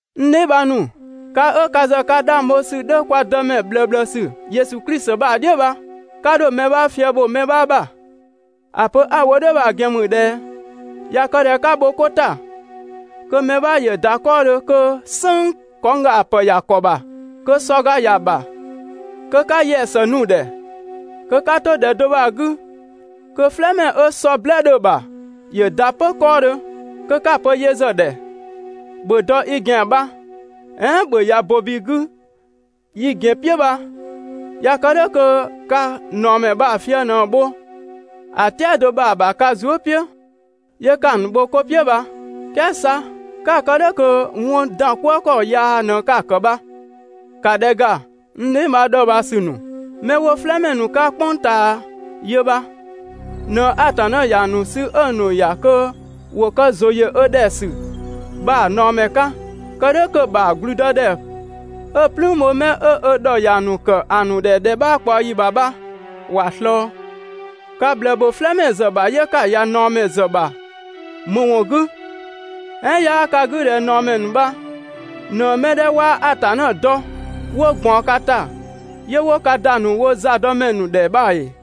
N dheebhang ‑nu, ka 'ö ka ‑zë ka 'dhang bho ‑sü 'dhö kwa Dëmɛ ꞊bhlëëbhlëësü Yesu Klisi bha‑ "dhiʋ̈ bha, 'ka 'dho mɛ 'bha fië‑ ‑bho mɛ 'bha ‑bha. ‑A pö 'a‑ wo "dhʋ̈ bha‑ ‑gɛn ‑mü ꞊dhɛ ꞊ya kë ꞊dhɛ 'ka bho 'ko ‑ta, kö mɛ 'bha ‑yö ‑da 'kɔɔdhö kö "sënng kɔnggaapë ‑ya ‑kɔ ‑bha, kö sɔga ‑ya ‑bha, kö 'ka ‑yɛa ‑së nu‑ ‑dhɛ, kö 'ka 'to ‑dhɛ do bha‑ 'gü kö "flɛɛmɛ 'ö sɔ "blë 'dhö‑ ‑bha ‑yö ‑da 'pö 'kɔɔdhö, kö 'ka‑ pö yö ‑zë ‑dhɛ: «‑Bhö dɔ i ‑gɛan bha!» "ɛɛn «‑Bhö ‑ya ‑bobi 'gü yi ‑gɛn "piʋ̈ bha!»; ꞊ya kë "dhʋ̈ kö 'ka ꞊naɔmɛ bha‑ fië‑ ꞊në‑ bho‑ "tɛado bha‑ ‑bha ka zuë" "piʋ̈ 'yö 'ka‑ ‑nu bho 'ko "piʋ̈ bha. "Kɛɛ 'sa 'ka‑ kë "dhʋ̈ kö 'wɔn ‑dan "kwëë ‑kɔ yaa ꞊në 'ka‑ ‑kë bha. ‑Ka ‑dhɛ ‑ga, n dheebhang dhɔɔbhaasü ‑nu, 'mɛ 'wo "flɛɛmɛ ‑nu 'ka "kpʋng ꞊taa yö bha ꞊në Atanna ‑ya ‑nu sü 'ö‑ ‑nu ‑ya kö ‑wo kë ‑zʋ ‑yö ö ‑dhɛ ‑sü bha‑ ꞊naɔmɛ 'ka, kë "dhʋ̈ kö‑ ‑bha ‑gblüdëdhɛ 'ö‑ "plüün bho 'mɛ 'ö ö ‑dhɔ ‑ya ‑nu ‑kë ‑a ‑nu ‑dhɛ ‑dhɛ 'bha ꞊kpaɔyi ‑bha bha ‑wa ꞊slɔɔ. Ka ꞊bhlëë ‑bho "flɛɛmɛ ‑zë ‑bha 'yö 'ka‑ ‑ya ꞊naɔmɛ ‑zë ‑bha ‑më ‑wɔn 'gü? "Ɛɛn 'yaa ka 'gü ꞊dhɛ ꞊naɔmɛ ‑nu bha ꞊në (mɛ 'dhɛ 'waa Atanna dɔ) 'wo ꞊gbaɔn ka ‑ta, 'yö 'wo ka ‑da ‑nu wo zadɔmɛ ‑nu ‑dhɛ bha ‑ee?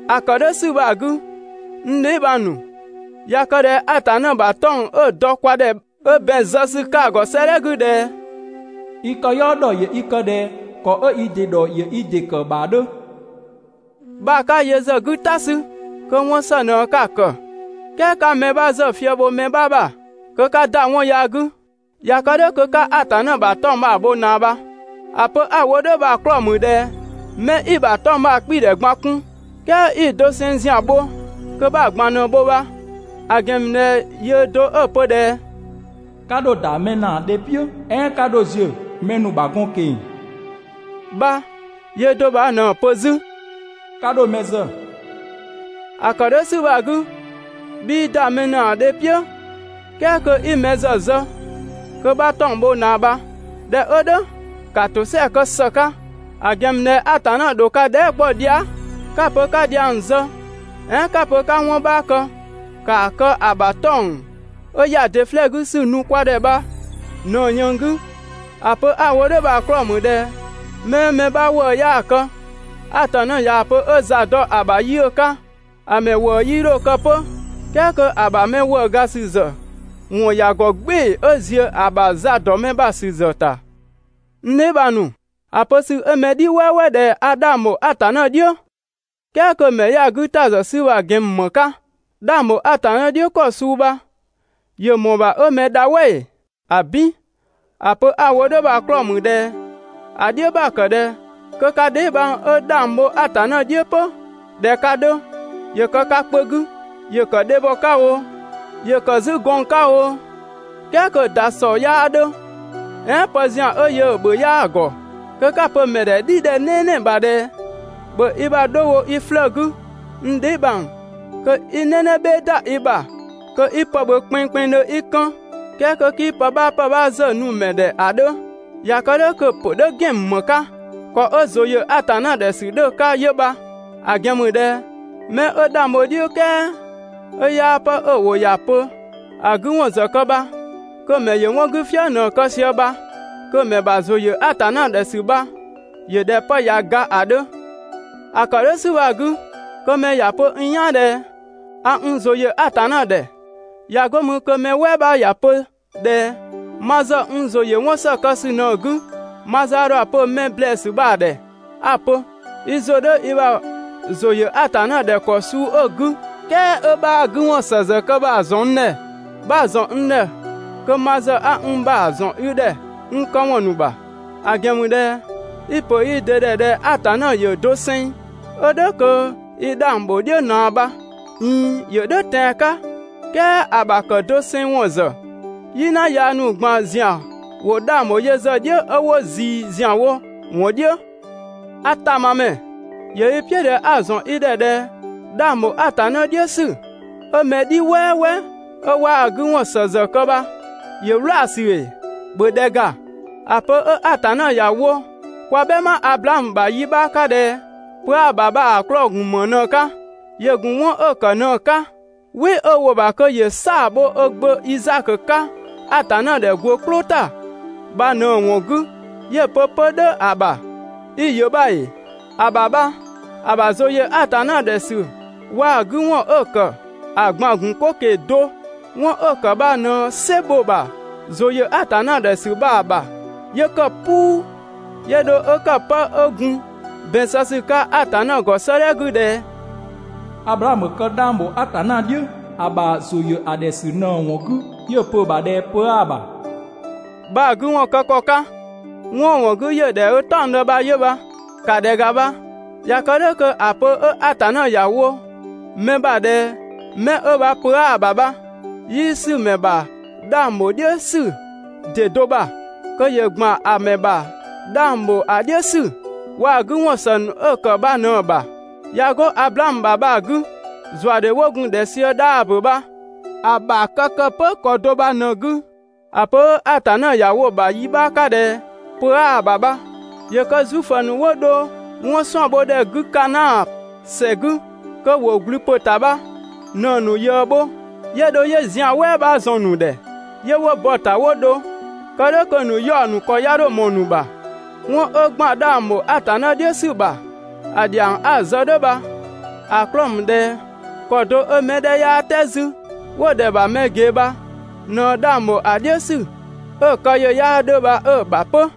‑A ‑kë "dhʋ̈ ‑sü bha‑ 'gü, n dheebhang ‑nu, ꞊ya kë ꞊dhɛ Atanna ‑bha 'tɔng‑ 'ö‑ dɔ kwa ‑dhɛ 'ö ‑bɛn zë ‑sü 'ka‑ ‑gɔ 'sëëdhɛ 'gü ꞊dhɛ: «I këyɔɔ ‑dhɔ ‑yö i kë ꞊dhɛ ‑kɔ 'ö i ‑dɩ ‑dhɔ ‑yö i ‑dɩ ‑kë ‑bha ‑a 'dhö» bha 'ka yö ‑zë 'gü "ta 'sü, kö 'wɔn ‑së ꞊në 'ka‑ kë. "Kɛɛ 'ka mɛ 'bha ‑zë fië‑ bho mɛ 'bha ‑bha, kö 'ka ‑da 'wɔn yaa 'gü. ꞊Ya kë "dhʋ̈ kö 'ka Atanna ‑bha 'tɔng‑ bha‑ bho ꞊naa bha. ‑A pö 'a‑ wo "dhʋ̈ bha‑ 'klɔɔ‑ ‑mü ꞊dhɛ 'mɛ 'i‑ ‑bha 'tɔng‑ bha‑ 'kpiidhɛ ꞊gban kun, "kɛɛ 'ö 'i‑ doseng ‑zian bho, kö 'bha‑ ꞊gban ꞊në‑ bho bha. ‑A ‑gɛn ‑mü ꞊dhɛ yöö do 'ö‑ pö ꞊dhɛ: «'Ka 'dho ‑da mɛ ‑naadhe "piʋ̈ "ɛɛn 'ka 'dho ziö mɛ ‑nu ‑bha gɔn ꞊keng‑» bha, yöö do bha ꞊në‑ pö 'zü: «'Ka 'dho mɛ zë». ‑A ‑kë "dhʋ̈ ‑sü bha‑ 'gü, 'bhii ‑da mɛ ‑naadhe "piʋ̈ "kɛɛ kö i mɛ ‑zë zë, kö 'bha 'tɔng‑ bho ꞊naa bha. ꞊Dhɛ 'ö "dhʋ̈ ‑ka ‑tosɛa kë ‑së 'ka, ‑a ‑gɛn ‑mü ꞊dhɛ Atanna dho ka dhɛɛ" 'kpɔ dhia". 'Ka‑ pö 'ka dhiang zë, "ɛɛn 'ka‑ pö 'ka 'wɔn 'bha kë ‑kaa kë ‑a ‑bha 'tɔng‑ 'ö ‑ya 'flëë‑ 'gü ‑sü nu kwa ‑dhɛ bha ꞊në‑ ꞊yënng 'gü. ‑A pö 'a‑ wo "dhʋ̈ bha‑ 'klɔɔ‑ ‑mü ꞊dhɛ 'mɛ 'ö mɛ 'bha ‑wëë 'yaa‑ kë, Atanna ꞊yaa‑ pö 'ö za dɔ‑ ‑bha yi 'ö‑ 'ka, ‑a ‑mɛ ‑wëë 'yii 'dho‑ kë 'pö, "kɛɛ kö ‑a ‑bha mɛ ‑wëëga ‑sü ‑zë ‑wɔn ‑ya ‑gɔ "gbɩɩ‑ 'ö ‑ziö ‑a ‑bha za ‑dɔ mɛ ‑bha ‑sü ‑zë ‑ta. N dheebhang ‑nu, ‑a pö ‑sü 'ö mɛ "dhi "wɛɛwɛɛ ꞊dhɛ a 'dhang ‑bho Atanna "dhiʋ̈, "kɛɛ kö‑ ‑mɛ 'yaa‑ 'gü ‑ta ‑zë 'sü bha‑ ‑gɛn ‑mü ‑më 'ka? 'Dhang ‑bho Atanna "dhiʋ̈ ‑kɔ suu bha ‑yö ‑mɔɔ ‑bha 'ö‑ ‑mɛ dha "wɛ ‑ee? ‑Abin! ‑A pö 'a‑ wo "dhʋ̈ bha‑ 'klɔɔ‑ ‑mü ꞊dhɛ ‑a "dhiʋ̈ ‑bha ‑kë ꞊dhɛ kö ka dheebhang 'ö 'dhang bho Atanna "dhiʋ̈ 'pö ꞊dhɛ ka 'dhö ‑yö kë ka kpö 'gü, ‑yö ‑kë dhebhɔ 'ka oo, ‑yö ‑kë 'zü gɔɔn‑ 'ka oo, "kɛɛ kö‑ ‑dasɔ 'yaa 'dhö, "ɛɛn pë ‑zian 'ö yöö‑ ‑bhö 'yaa‑ ‑gɔ; kö 'ka‑ pö‑ ‑mɛ ‑dhɛ "dhi ‑dhɛ "nɛɛnɛɛdhɛ ‑bha ꞊dhɛ: «‑Bhö i ‑bha 'dho wo i 'flëë‑ 'gü, n dheebhang, kö 'i "nɛnɛ "bhɛɛ ‑da i ‑bha, kö 'i pë ‑bhö kpɛnngkpɛnngdhö 'i 'kën», "kɛɛ kö 'kii pë 'bha ‑pë 'bha ‑zë nu‑ ‑mɛ ‑dhɛ ‑a 'dhö. ꞊Ya kë "dhʋ̈ kö‑ ‑pö "dhʋ̈ ‑gɛn ‑mü ‑më 'ka? ‑Kɔ 'ö ‑zʋ ‑yö Atanna ‑dhɛ ‑sü 'dhö‑ 'ka 'yö bha, ‑a ‑gɛn ‑mü ꞊dhɛ 'mɛ 'ö 'dhang bho‑ "dhiʋ̈ "kɛɛ 'ö 'yaa 'pë 'ö‑ ‑wʋ ‑ya pö‑ 'gü ‑wɔn ‑zë kë bha kö‑ ‑mɛ ‑yö 'wɔn 'gü "fië ꞊në‑ kë sië bha; kö‑ ‑mɛ ‑bha ‑zʋ ‑yö ‑a ‑dhɛ ‑sü bha ‑yö ꞊dhɛ 'pë ꞊ya ga ‑a 'dhö. ‑A kë "dhʋ̈ ‑sü bha‑ 'gü, kö mɛ ‑ya pö n "yaan ꞊dhɛ: «A n ‑zʋ ‑yö Atanna ‑dhɛ», ꞊ya 'go mü kö mɛ "wɛɛ 'bha ‑ya pö ꞊dhɛ: «Ma ‑zë n ‑zʋ ‑yö 'wɔn ‑së kë ‑sü ꞊në‑ 'gü», ma ‑zë a ‑dho ‑a pö mɛ ‑blɛɛsü bha‑ ‑dhɛ 'a‑ pö: «I ‑zʋ 'dhö i ‑bha ‑zʋ ‑yö Atanna ‑dhɛ ‑kɔ suu 'ö‑ 'gü, "kɛɛ 'ö 'bhaa‑ 'gü ‑wɔn ‑së ‑zë kë bha‑ ‑zɔn n ‑dhɛ. 'Bha‑ ‑zɔn n ‑dhɛ kö ma ‑zë 'a n ‑bha ‑zɔn i ‑dhɛ n këwɔn ‑nu ‑bha.» ‑A ‑gɛn ‑mü ꞊dhɛ i‑ ‑pö i ‑dɩ ‑dhɛ ꞊dhɛ «Atanna ‑yö doseng», 'ö "dhʋ̈ kö i 'dhang ‑bho "dhiʋ̈ ꞊naa bha. ꞊Iin ‑yö "dhʋ̈ tɛan‑ 'ka "kɛɛ ‑a ‑bha ‑kë doseng ‑wɔn ‑zë "yina yaa ‑nu ꞊gban ‑zian ‑wo 'dhang ‑bho yö ‑zë "dhiʋ̈ 'ö 'wo ꞊zii ‑zianwo ‑wɔn "dhiʋ̈. A ‑tamamɛ! ‑Yö i "piʋ̈ ꞊dhɛ 'a‑ ‑zɔn i ꞊dhɛ ꞊dhɛ 'dhang ‑bho Atanna "dhiʋ̈ ‑sü 'ö mɛ "dhi "wɛɛwɛɛ 'ö 'waa‑ 'gü ‑wɔn ‑së ‑zë kë bha ‑yö "wlaasü ‑ee? ‑Bhö ‑dhɛ ‑ga! ‑A pö 'ö Atanna ‑ya wo kwa "bhɛma Ablaamö ‑bha yi 'bha 'ka ꞊dhɛ pö 'aa‑ ‑bha bha‑ 'klɔɔ‑ ‑gun ‑më ꞊në‑ 'ka? ‑Yö ‑gun 'wɔn 'ö‑ ‑kë ꞊në‑ 'ka. "Wɩ 'ö‑ wo‑ ‑bha kö ‑yö "saa‑ bho ö gbö Izaakö 'ka Atanna ‑dhɛ ‑gwë "klʋ ‑ta bha ꞊në‑ ‑wɔn 'gü 'yö‑ pö 'pö "dhʋ̈ ‑a ‑bha. I‑ ‑yö bha ‑ee? ‑A ‑bha bha ‑a ‑bha ‑zʋ ‑yö Atanna ‑dhɛ ‑sü waa‑ 'gü ‑wɔn 'ö‑ ‑kë ‑a ꞊gban‑ ‑gun 'ko ꞊keng‑ do. 'Wɔn 'ö‑ ‑kë bha ꞊në "sɛ bho‑ ‑bha ‑zʋ ‑yö Atanna ‑dhɛ ‑sü bha‑ ‑bha 'yö ‑kë "puu. 'Yö dho 'ö ‑kë 'pë 'ö gun ‑bɛn zë ‑sü 'ka Atanna ‑gɔ 'sëëdhɛ 'gü ꞊dhɛ: «Ablaamö kë 'dhang ‑bho Atanna "dhiʋ̈, ‑a ‑bha ‑zʋ ‑yö ‑a ‑dhɛ ‑sü ꞊në‑ ‑wɔn 'gü 'yö‑ pö‑ ‑bha ꞊dhɛ pö 'aa‑ ‑bha» bha‑ 'gü ‑wɔn kë ‑kɔ 'ka. 'Wɔn 'ö‑ ‑wɔn 'gü 'yö‑ ‑dhɛ ö "taɔngdë bha 'yö bha. ‑Ka ‑dhɛ ‑ga bha, ꞊ya kë "dhʋ̈ kö ‑a pö 'ö Atanna ‑ya wo mɛ ‑bha ꞊dhɛ 'mɛ 'ö bha pö 'aa‑ ‑bha bha, 'yii 'sü‑ ‑mɛ ‑bha 'dhang bho‑ "dhiʋ̈ ‑sü ‑dɩ do ‑bha, kö ‑yö ‑gban ‑a ‑mɛ ‑bha 'dhang ‑bho ‑a "dhiʋ̈ ‑sü waa‑ 'gü ‑wɔn ‑së ‑nu 'ö‑ ‑kë bha ꞊në‑ ‑bha. ꞊Ya 'go Ablaamö ‑bha bha‑ 'gü, ‑zuadhe 'wo gun‑ ‑dhɛ sië Dhaabö bha‑ ‑bha kë ‑kë 'pö ‑kɔ do bha ꞊në‑ 'gü. ‑A pö 'ö Atanna ‑ya wo‑ ‑bha yi 'bha 'ka ꞊dhɛ pö 'aa‑ ‑bha bha ‑yö kë Zuifö ‑nu 'wo dho 'wɔn 'suan‑ bho ‑dhɛ 'gü Kanaa ‑sɛ 'gü (kö ‑wo ‑gblü ‑pö ‑ta bha) ꞊në‑ ‑nu ꞊yëë bho, 'yö dho 'yö zian "wɛɛ 'bha ‑zɔn ‑nu ‑dhɛ, 'yö 'wo bɔ‑ ‑ta 'wo dho (kë "dhʋ̈ kö‑ ‑nu 'yaɔ‑ ‑nu ‑kɔ 'ya 'dho ꞊mɔɔ‑ ‑nu ‑bha). 'Wɔn 'ö ‑gban 'dhang ‑bho Atanna "dhiʋ̈ ‑sü ‑bha ‑a ‑dhiang 'a‑ zë "dhʋ̈ bha‑ 'klɔɔ‑ ‑mü ꞊dhɛ ‑kɔ do 'ö mɛ 'dhɛ 'ö 'yaa "tɛɛ 'zü 'wo‑ ‑dhɛ ‑bha mɛ ꞊gee bha ꞊në 'dhang ‑bho ‑a "dhiʋ̈ ‑sü 'ö‑ kë ‑yë 'yaa 'dhö bha 'ö‑ ‑bha 'pö.